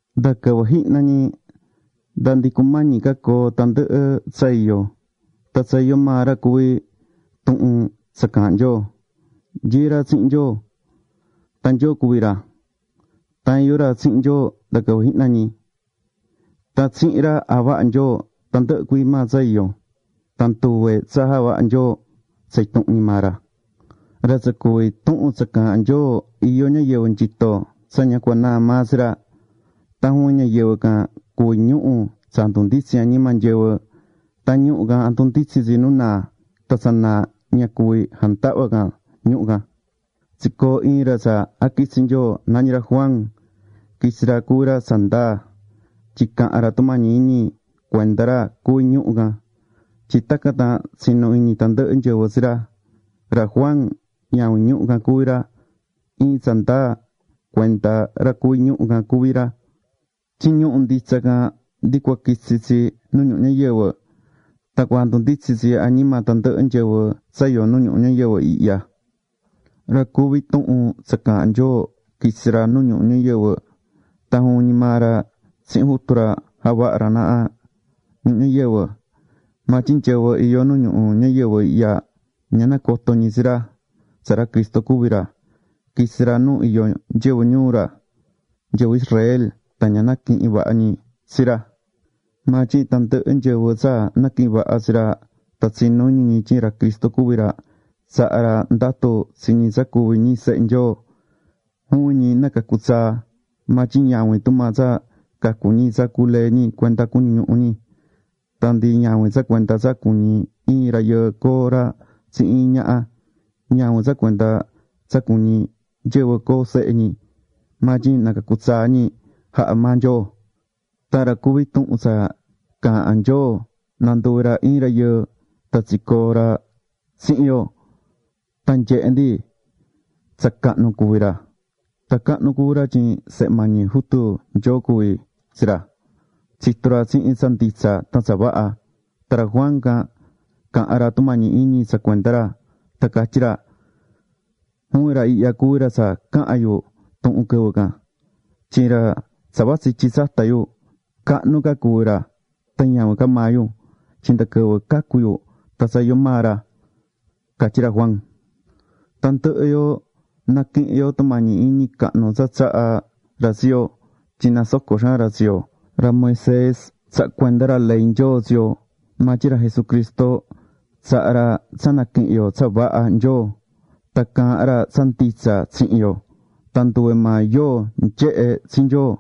Nda quɨvɨ jihna ñi, nda ndi cumañi ca coo tandɨhɨ tsa iyó, tan tsa iyó maa ra cuví Tuhun tsa Caahán Nyoo. Nyií ra tsihin Nyoo. Tan Nyoo cuví ra. Tan iyó ra tsihin Nyoo nda quɨvɨ jihna ñi. Tan tsihin ra, javaha̱ Nyoo tandɨhɨ cuii maa tsa iyó. Tan nduve tsa javaha̱ Nyoo tsa intuhun ñi maa ra. Ra tsa cuví Tuhun tsa Caahán Nyoo iyó ñayɨvɨ nyito tsa ña cua naa maa tsi ra. Tan juvin ñayɨvɨ can, cuví ñuhu̱ tsa jandunditsín añima nyɨvɨ. Tan ñuhu̱ can, jandunditsín tsi nu naa. Tan tsa naa can ña cuví jandahva can ñuhu̱ nditsin can. Tsicoo̱ iin ra tsa jaquitsi̱ Nyoo, nañí ra Juan. Quitsi̱ ra cuvi̱ ra tsa ndaa. Tyin caha̱n ra tumañi iñi cuenda ra cuví ñuhu̱ can, tyin tacan tan tsinu iñi tandɨhɨ nyɨvɨ tsi ra. Ra Juan, ñavin ñuhu̱ can cuví ra. Iin tsa ndaa cuenda ra cuví ñuhu̱ can cuví ra. Tyin ñuhu̱ nditsa can, ndi cua quitsi tsi nu ñuhu ñayɨvɨ, tan cua jandunditsín tsi añima tandɨhɨ nyɨvɨ tsa iyó nu ñuhu ñayɨvɨ ihya. Ra cuví Tuhun tsa Caahán Nyoo quitsi̱ ra nu ñuhu ñayɨvɨ. Tan juvin ñi maa ra tsihin Jutu ra javaha̱ ra naha ñuhu ñayɨvɨ. Maa tyin nyɨvɨ iyó nu ñuhu ñayɨvɨ ihya, ña nacoto̱ ñi tsi ra tsa ra Cristo cuví ra. Quitsi̱ ra nu iyó nyɨvɨ ñuu ra, nyɨvɨ Israel, tan ña naquihi̱n vaha ñi tsi ra. Maa tyin tandɨhɨ nyɨvɨ tsa naquihi̱n vaha tsi ra, tan tsinú iñi ñi tyin ra Cristo cuví ra, tsaha̱ ra ndatu tsi ñi tsa cuví ñi sehe Nyoo. Juvin ñi nacacu̱ tsaa. Maa tyin ñavin tumaa tsa cacu̱ ñi tsa culee̱ ñi cuenda cuñu ñuhu ñi. Tan ndi ñavin tsa cuenda tsa cuñí iin rayɨɨ coo ra tsihin iin ñaha. Ñavin tsa cuenda tsa cuñí nyɨvɨ coo sehe ñi. Maa tyin nacacu̱ tsaa ñi jaha̱ maa Nyoo. Tan ra cuví Tuhun tsa Caahán Nyoo nanduvi̱ ra iin rayɨɨ. Tan tsicoo̱ ra tsihin yo. Tan nyehe̱ ndi tsa cahnu cuví ra. Tan cahnu cuví ra tyin Sehe mañi Jutu Nyoo cuví tsi ra. Tsitu̱ ra tsihin tsa nditsa tan tsa vaha. Tan ra Juan can caha̱n ra tumañi iñi tsa cuenda ra, tan catyí ra: ―Juvin ra ihya cuví ra tsa caha̱n yu tuhun quɨvɨ can, tyin ra tsa vatsí ityi tsata yu, cahnu ca cuví ra tan ñavin ca maa yu. Tyin nda quɨvɨ cacu̱ yu tan tsa iyó maa ra ―catyí ra Juan. Tandɨhɨ yo naquihín yo tumañi iñi cahnu tsa tsahá ra tsi yo, tyin nasocó xaan ra tsi yo. Ra Moisés tsaha̱ cuenda ra ley Nyoo tsi yo. Maa tyin ra Jesucristo tsahá ra tsa naquihin yo tsa vaha Nyoo. Tan caahán ra tsa nditsa tsihin yo. Tan nduve maa yóo nyehé tsi Nyoo.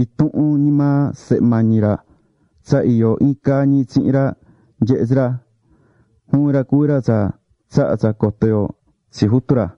Intuhun ñi maa Sehe mañi maa ra tsa iyó iin caa ñi tsihin ra nyehé tsi ra. Juvin ra cuví ra tsa tsahá tsa coto yo tsi Jutu ra.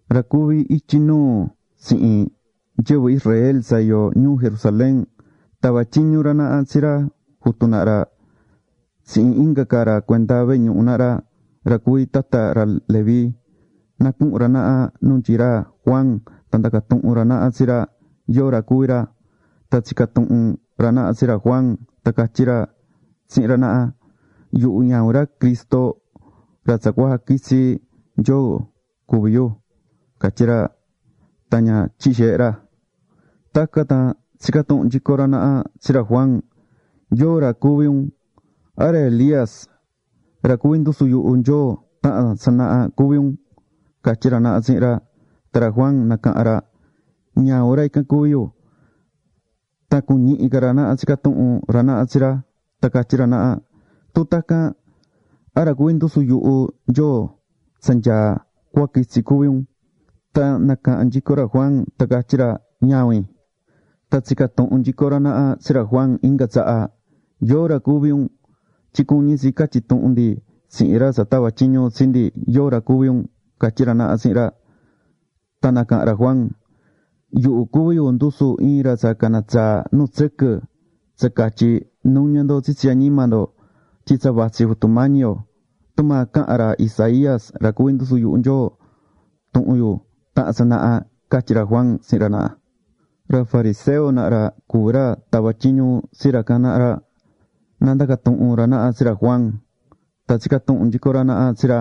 Ra cuví ityi nuu tsihin nyɨvɨ Israel tsa iyó ñuu Jerusalén, tava̱ tyiñu ra naha tsi ra jutu naha ra tsihin inga ca ra cuenda vehe ñuhu naha ra, ra cuví tata ra Leví, na cuhun ra naha nu nyií ra Juan tan ndaca tuhun ra naha tsi ra yóo ra cuví ra. Tan tsica̱ tuhun ra naha tsi ra Juan tan catyí ra tsihin ra naha: ―Yuhu ñavin ra Cristo ra tsa cua jaquitsi Nyoo cuví yu ―catyí ra tan ña tyihi̱ xeehe ra. Tacan tan tsica̱ tuhun nyico ra naha tsi ra Juan: ―¿Yóo ra cuví un? ¿A ra Elías, ra cuvi̱ ndusu yuhu Nyoo taha̱n tsanaha cuví un? ―catyí ra naha tsihin ra. Tan ra Juan nacahan ra: ―Ñavin ra ican cuví yu. Tan cuñihi̱ ca ra naha tsica̱ tuhun ra naha tsi ra, tan catyí ra naha: ―Tun tacan, ¿a ra cuví ndusu yuhu Nyoo tsa nyaá tsa cua quitsi cuví un? Tan nacaha̱n nyico ra Juan tan catyí ra: ―Ñavin. Tan tsica̱ tuhun nyico ra naha tsi ra Juan inga tsaha: ―¿Yóo ra cuví un? Tyin cuñí tsi catyi tuhun ndi tsihin ra tsa tava̱ tyiñu tsi ndi yóo ra cuví un ―catyí ra naha tsihin ra. Tan nacaha̱n ra Juan: ―Yuhu cuví ndusu iin ra tsa cana tsaá nu tsɨquɨ, tsa catyí: “Nu̱ña ndo tsitsi añima ndo tyin tsa vatsí Jutu Mañi yo.” Tumaa caha̱n ra Isaías ra cuvi̱ ndusu yuhu Nyoo tuhun yu taha̱n tsanaha ―catyí ra Juan tsihin ra naha. Ra fariseo naha ra cuví ra tava̱ tyiñu tsi ra can naha ra, na ndaca tuhun ra naha tsi ra Juan. Tan tsica̱ tuhun nyico ra naha tsi ra: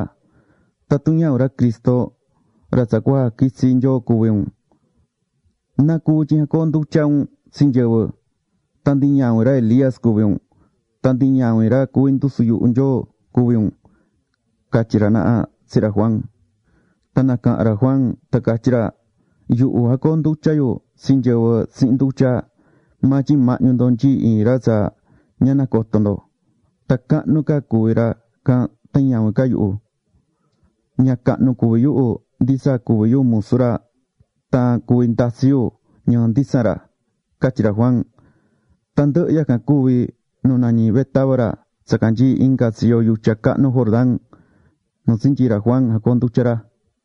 ―Tatun ñavin ra Cristo, ra tsa cua jaquitsi Nyoo cuví un, ¿nacuvi tyin jacoondutyá un tsi nyɨvɨ? tan ndi ñavin ra Elías cuví un, tan ndi ñavin ra cuví ndusu yuhu Nyoo cuví un ―catyí ra naha tsihin ra Juan. Tan nacaha̱n ra Juan tan catyí ra: ―Yuhu jacoondutyá yu tsi nyɨvɨ tsihin ndutya. Maa tyin mahñu ndo nyií iin ra tsa ña nacotó ndo. Tan cahnu ca cuví ra can tan ñavin ca yuhu. Ña cahnu cuví yuhu ndi tsa cuví yu musu ra tan cuvi ndatsi yu ñɨɨ nditsan ra ―catyí ra Juan. Tandɨhɨ yacan cuvi̱ nu nañí Betábara tsa canyií inga tsiyo yutya cahnu Jordán nu tsinyii̱ ra Juan jacoondutya̱ ra.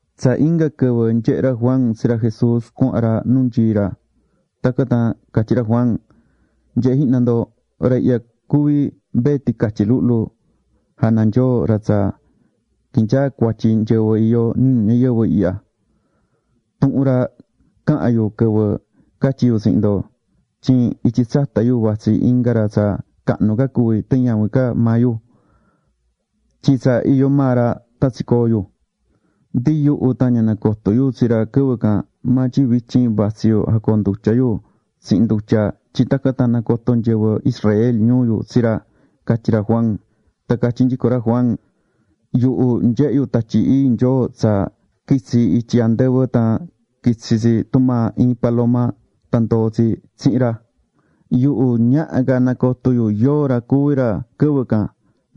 Tsa inga quɨvɨ nyehe̱ ra Juan tsi ra Jesús cuahán ra nu nyií ra, tacan tan catyí ra Juan: ―Nye̱he jihna ndo, ra ihya cuví Mbee Ticatyi Luhlu jana Nyoo ra tsa quihín nyaa cuatyi nyɨvɨ iyó nu ñuhu ñayɨvɨ ihya. Tuhun ra caha̱n yu quɨvɨ catyi̱ yu tsihin ndo tyin ityi tsata yu vatsí inga ra tsa cahnu ca cuví tan ñavin ca maa yu, tyin tsa iyó maa ra tan tsicoo̱ yu. Ndi yuhu tan ña nacoto̱ yu tsi ra quɨvɨ can. Maa tyin vityin vatsí yu jacoondutyá yu tsihin ndutya tyin tacan tan nacoto nyɨvɨ Israel ñuu yu tsi ra ―catyí ra Juan. Tan catyí nyico ra Juan: ―Yuhu nyehe̱ yu Tatyi Ii Nyoo tsa quitsi̱ ityi andɨvɨ tan quitsi̱ tsi tumaa iin paloma, tan ndoo̱ tsi tsihin ra. Yuhu ñaha ca nacoto yu yóo ra cuví ra quɨvɨ can.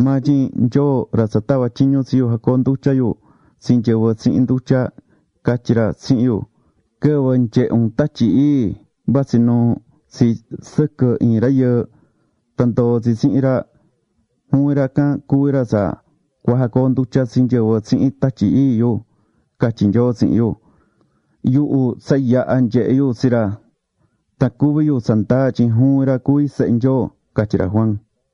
Maa tyin Nyoo, ra tsa tava̱ tyiñu tsi yu jacoondutya yu tsi nyɨvɨ tsihin ndutya, catyi̱ ra tsihin yu: “Quɨvɨ nyehe un Tatyi Ii, vatsí nuú tsi sɨquɨ iin rayɨɨ, tan ndoo tsi tsihin ra, juvin ra can cuví ra tsa cua jacoondutya tsi nyɨvɨ tsihin Tatyi Ii yu”, catyi̱ Nyoo tsihin yu. Yuhu tsa yaha̱ nyehe̱ yu tsi ra. Tan cuví yu tsa ndaa tyin juvin ra cuví Sehe Nyoo ―catyí ra Juan.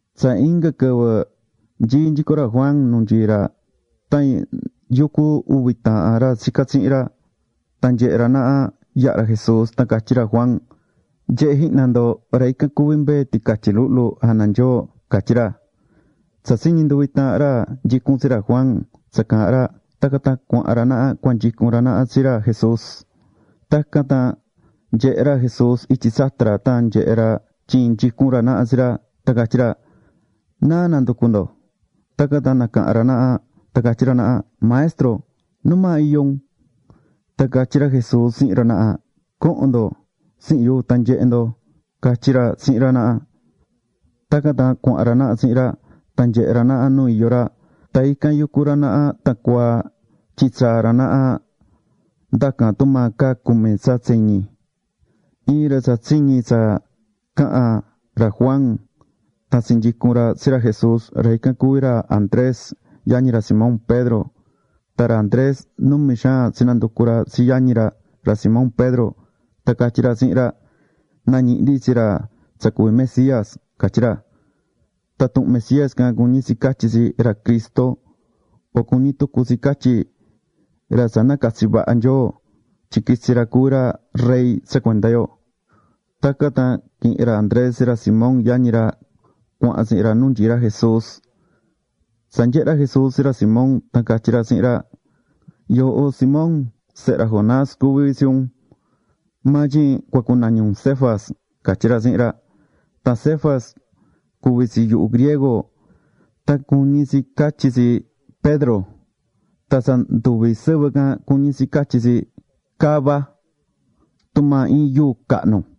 Tsa inga quɨvɨ nyií nyico ra Juan nu nyií ra tan yucú ndɨhɨ uvi taahan ra tsicá tsihin ra. Tan nyehe̱ ra naha, yahá ra Jesús, tan catyí ra Juan: ―Nye̱he jihna ndo, ra ican cuví Mbee Ticatyi Luhlu jana Nyoo ―catyí ra. Tsa tsiñi̱ nduvi taahan ra nyicún tsi ra Juan tsa caha̱n ra, tacan tan cuahan ra naha cuanyicun ra naha tsi ra Jesús. Tacan tan nanyehe̱ ra Jesús ityi tsata ra, tan nyehe̱ ra tyin nyicún ra naha tsi ra, tan catyí ra: ―¿Náa nanducú ndo? Tacan tan nacaha̱n ra naha tan catyí ra naha: ―Maestro, ¿numaa iyó un? Tan catyí ra Jesús tsihin ra naha: ―Co̱hon ndo tsihin yu, tan nyehe ndo ―catyí ra tsihin ra naha. Tacan tan cuahán ra naha tsihin ra. Tan nyehe̱ ra naha nu iyó ra. Tan ican yucu ra naha tan cuaa, tyin tsaa̱ ra naha ndacan tumaa caa cumi tsa tseñi. Iin ra tsa tsiñi̱ tsa caha̱n ra Juan tan tsinyicu̱n ra tsi ra Jesús ra ican cuví ra Andrés, yañi ra Simón Pedro. Tan ra Andrés numi xaan tsinanducu̱ ra tsi yañi ra, ra Simón Pedro, tan catyí ra tsihin ra: ―Nañihi̱ ndi tsi ra tsa cuví Mesías ―catyí ra. Tan tuhun Mesías can cuñí tsi catyí, ra Cristo, o cuñí tucu tsi catyí, ra tsa nacatsi̱ vaha Nyoo tyin quitsi ra cuvi ra rey tsa cuenda yo. Tacan tan quihi̱n ra Andrés tsi ra Simón yañi ra cuahán tsihin ra nu nyií ra Jesús. Tsa nyehe̱ ra Jesús tsi ra Simón, tan catyí ra tsihin ra: ―Yooho Simón, sehe ra Jonás cuví tsi un. Maa tyin cua cunañi un Cefas ―catyí ra tsihin ra. Tan Cefas cuví tsi yuhu griego, tan cuñí tsi catyí tsi “Pedro”, tan tsa nduvi sɨvɨ can, cuñí tsi catyí tsi “cava”, [tumaa iin yuu cahnu].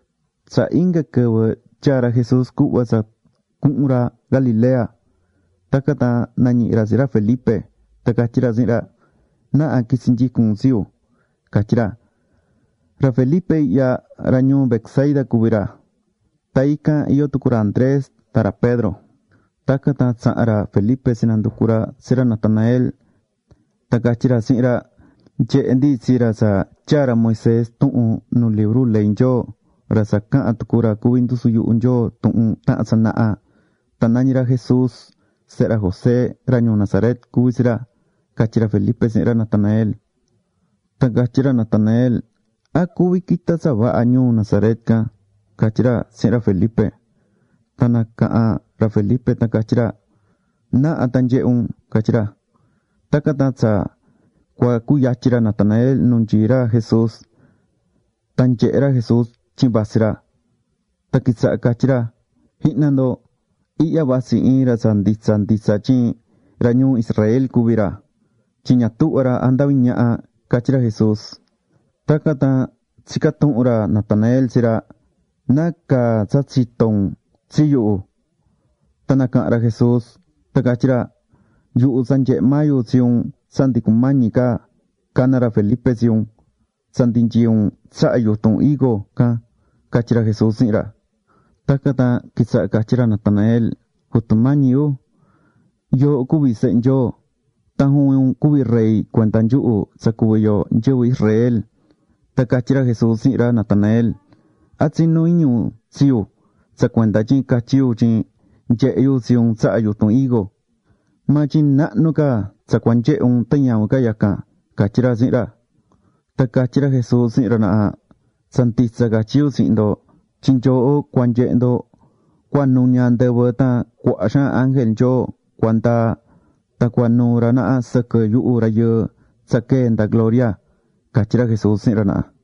Tsa inga quɨvɨ tyaa̱ ra Jesús cuhva tsa cuhun ra Galilea. Tacan tan nañihi̱ ra tsi ra Felipe. Tan catyí ra tsihin ra: ―Na̱ha qu̱itsi nyicun un tsi yu ―catyí ra. Ra Felipe ihya, ra ñuu Betsaida cuví ra. Tan ican iyó tucu ra Andrés tan ra Pedro. Tacan tan tsaha̱n ra Felipe tsinanducu̱ ra tsi ra Natanael. Tan catyí ra tsihin ra: ―Nyehe̱ ndi tsi ra tsa tyaa̱ ra Moisés tuhun nu libru ley Nyoo, ra tsa caha̱n tucu ra cuvi̱ ndusu yuhu Nyoo tuhun taha̱n tsanaha. Tan nañí ra Jesús. Sehe ra José ra ñuu Nazaret cuví tsi ra ―catyí ra Felipe tsihin ra Natanael. Tan catyi̱ ra Natanael: ―¿A cuví quita tsa vaha ñuu Nazaret can? ―catyí ra tsihin ra Felipe. Tan nacaha̱n ra Felipe tan catyí ra: ―Na̱ha tan nye̱he un ―catyí ra. Tacan tan tsa cua cuyatyin ra Natanael nu nyií ra Jesús. Tan nanyehe̱ ra Jesús tyin vatsí ra, tan quitsaha̱ catyí ra: ―¡Jihna ndo! Ihya vatsí iin ra tsa nditsa nditsa tyin ra ñuu Israel cuví ra, tyin ña tuhvá ra jandaví ñaha ―catyí ra Jesús. Tacan tan tsica̱ tuhun ra Natanael tsi ra: ―¿Nacaa tsa tsitó un tsi yuhu? Tan nacaha̱n ra Jesús tan catyí ra: ―Yuhu tsa nyehe̱ maa yu tsi un tsa ndi cumañi ca cana ra Felipe tsi un, tsa ndi nyií un tsaha yutun higo can ―catyí ra Jesús tsihin ra. Tacan tan quitsaha̱ catyí ra Natanael: ―Jutu Mañi yu, yooho cuví Sehe Nyoo. Tan juvin un cuví rey cuenda nyuhu tsa cuví yo nyɨvɨ Israel. Tan catyí ra Jesús tsihin ra Natanael: ―¿A tsinú iñi un tsi yu tsa cuenda tyin catyí yu tyin nyehe̱ yu tsi un tsaha yutun higo? Maa tyin nahnu ca tsa cua nyehe un tan ñavin ca yacan ―catyí ra tsihin ra. Tan catyí ra Jesús tsihin ra naha: ―Tsa nditsa catyí yu tsihin ndo tyin nyooho cua nyehe ndo cua nuña andɨvɨ tan cuaha xaan ángel Nyoo cua ndaa, tan cua nuu ra naha sɨquɨ yuhu Rayɨɨ tsa quee̱ nda gloria ―catyí ra Jesús tsihin ra naha.